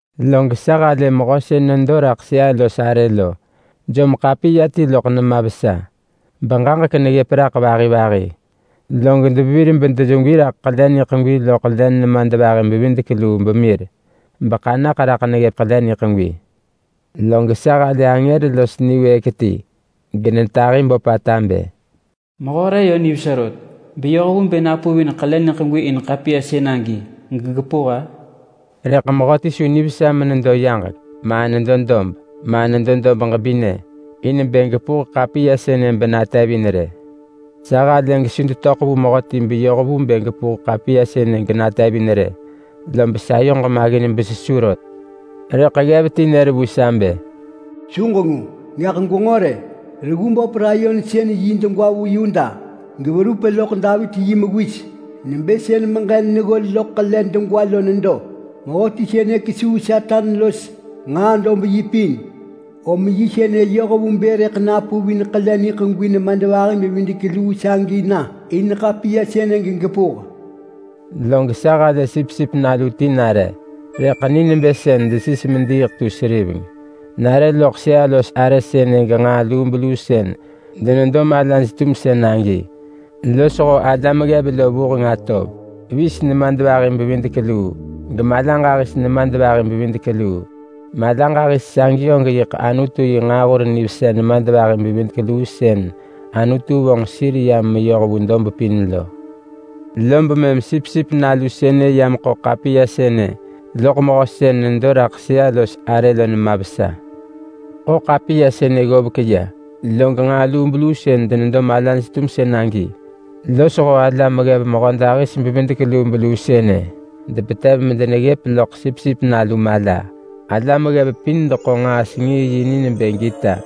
Log sa halë Mehö sën nedo raḳ sëa-los-arë lo jom ḳapiya ti loḳ nema vesa, beġaġek neggëp raḳ vahi vahi. Log devevir bedemir raḳ ḳele niḳegwi loḳ len nemadvahi-bevidek-luu, beḳanaḳ raḳ neggëp ḳele niḳegwi. Log sa halë angër los niwëëk ti genetahi böpata bë, “Mehö re yö nivesa rot, beyoh vu bë napuvin ḳele niḳegwi in ḳapiya sën agi gegepuh-a?” Rëḳ mehö ti su nivesa menedo yaġek, ma nedo dob, ma nedo dob ġebinë, in bë gepuh ḳapiya sënë benatevin rë. Sa halë gesu detöḳ vu mehöti beyoh vu bë gepuh ḳapiya sënë genatevin rë. Lob sayoġ maggin besesu rot. Rëḳ ggev ti nër vu sa bë, “Su ġengu! Gaḳ gwenġo rë! Reggu böp layon sën yi degwa vu Yuda geverup loḳ Davit-yi-mewis nebë sën meġen neggol loḳ ḳele degwa lo nedo. Mehöti sënë kesuu Satan los nġaa dob yi pin. Om yi sënë yoh vu bë rëḳ napuvin ḳele niḳegwi nemadvahi-bevidek-luu sagi na in ḳapiya sënë gegepuh.” Log sa halë Sipsip Nalu ti nare, rëḳ ni nebë sën desis mediiḳ tu seriveng. Nare loḳ sëa-los-arë sënë genġaa lubeluu sën denedo malaj-tumsën agi losho alam ggev lo vuheng atov. Vis nemadvahi-bevidek-luu, gemala ġahis nemadvahi-bevidek-luu. Mala ġahis sagi og yiḳ Anutu yi nġaahur nivesa nemadvahi-bevidek-luu sën Anutu vonġ sir ya meyoh vu dob pin lo. Lob mëm Sipsip Nalu sënë ya meḳo ḳapiya sënë loḳ Mehö sën nedo raḳ sëa-los-arë lo nema vesa. Ḳo ḳapiya sënë ggovek ya, log nġaa lubeluu sën denedo malaj-tumsën agi losho alam ggev mehödahis-bevidek-lubeluu sënë depetev medeneggëp loḳ Sipsip Nalu mala. Alam ggev pin deḳo nġaa-sengii-yi ni nebë gita,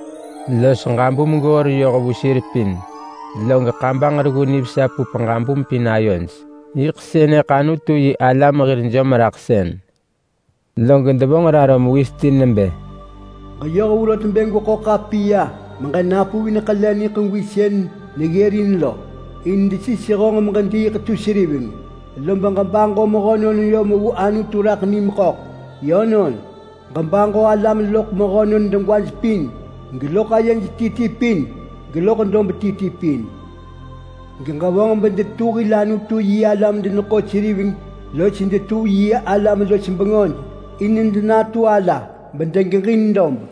los ġabum goor yoh vu sir pin. Log kabanġ reggu nivesa pup ġabum pin ayoj. Yiḳ sënëḳ Anutu-yi-alam hir jomraḳsën. Log devonġ raro mewis ti nebë: “Ġeyoh vu rot bë gweḳo ḳapiya beġenapuvin ḳele niḳegwi sën neggërin lo. In desis honġ meġediiḳ tu seriveng, lob ġebaġo mehönon yom vu Anutu raḳ nim ḳöḳ. Yönon, ġebaġo alam loḳ mehönon degwaj pin, geloḳ ayej ti ti pin, geloḳ dob ti ti pin. Geġevonġ bedetu hil Anutu-yi-alam-deneḳo-seriveng los detu yi alam-los-bengöj in denatu ala bedegeġin dob.”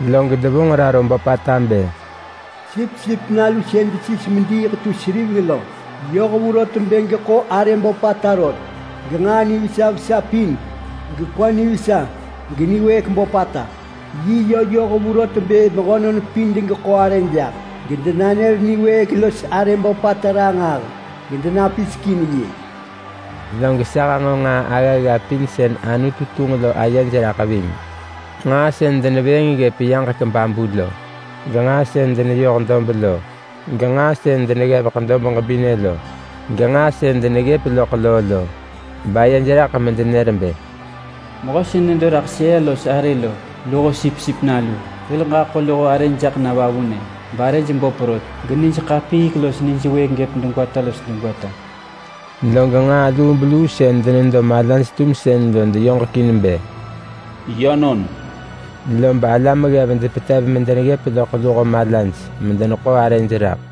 Log devonġ raro böpata bë: “Sipsip Nalu sën desis mediiḳ tu seriveng lo, yoh vu rot bë geḳo arë böpata rot, genġaa nivesa vesa pin, gekwa nivesa, geniwëëk böpata. Yi yö yoh vu rot bë mehönon pin degeḳo arë jaḳ, gedenanër niwëëk los arë böpata ranġah, gedenapisek in yi.” Log sa hanġo nġaa aggagga pin sën Anutu tunġ lo ayej raḳ ving. Nġaa sën denevëëng ggëp yaġek babu lo, genġaa sën deneyoh dob lo, genġaa sën deneggevek dob ġebinë lo, genġaa sën deneggëp loḳ loo lo, bayej raḳ medenër bë: “Mehö sën nedo raḳ sëa-los-arë lo luho Sipsip Nalu, hil ġaḳo luho arëj jaḳ na vavunë, barëj böp rot, genij ḳapiik los nij wëëk gëp degwata los degwata!” Log nġaa lubeluu sën denedo malaj-tumsën lo deyoġekin bë, “Yönon!” Lob alam ggev depetev medeneggëp loḳ luho malaj medeneḳo arëj raḳ.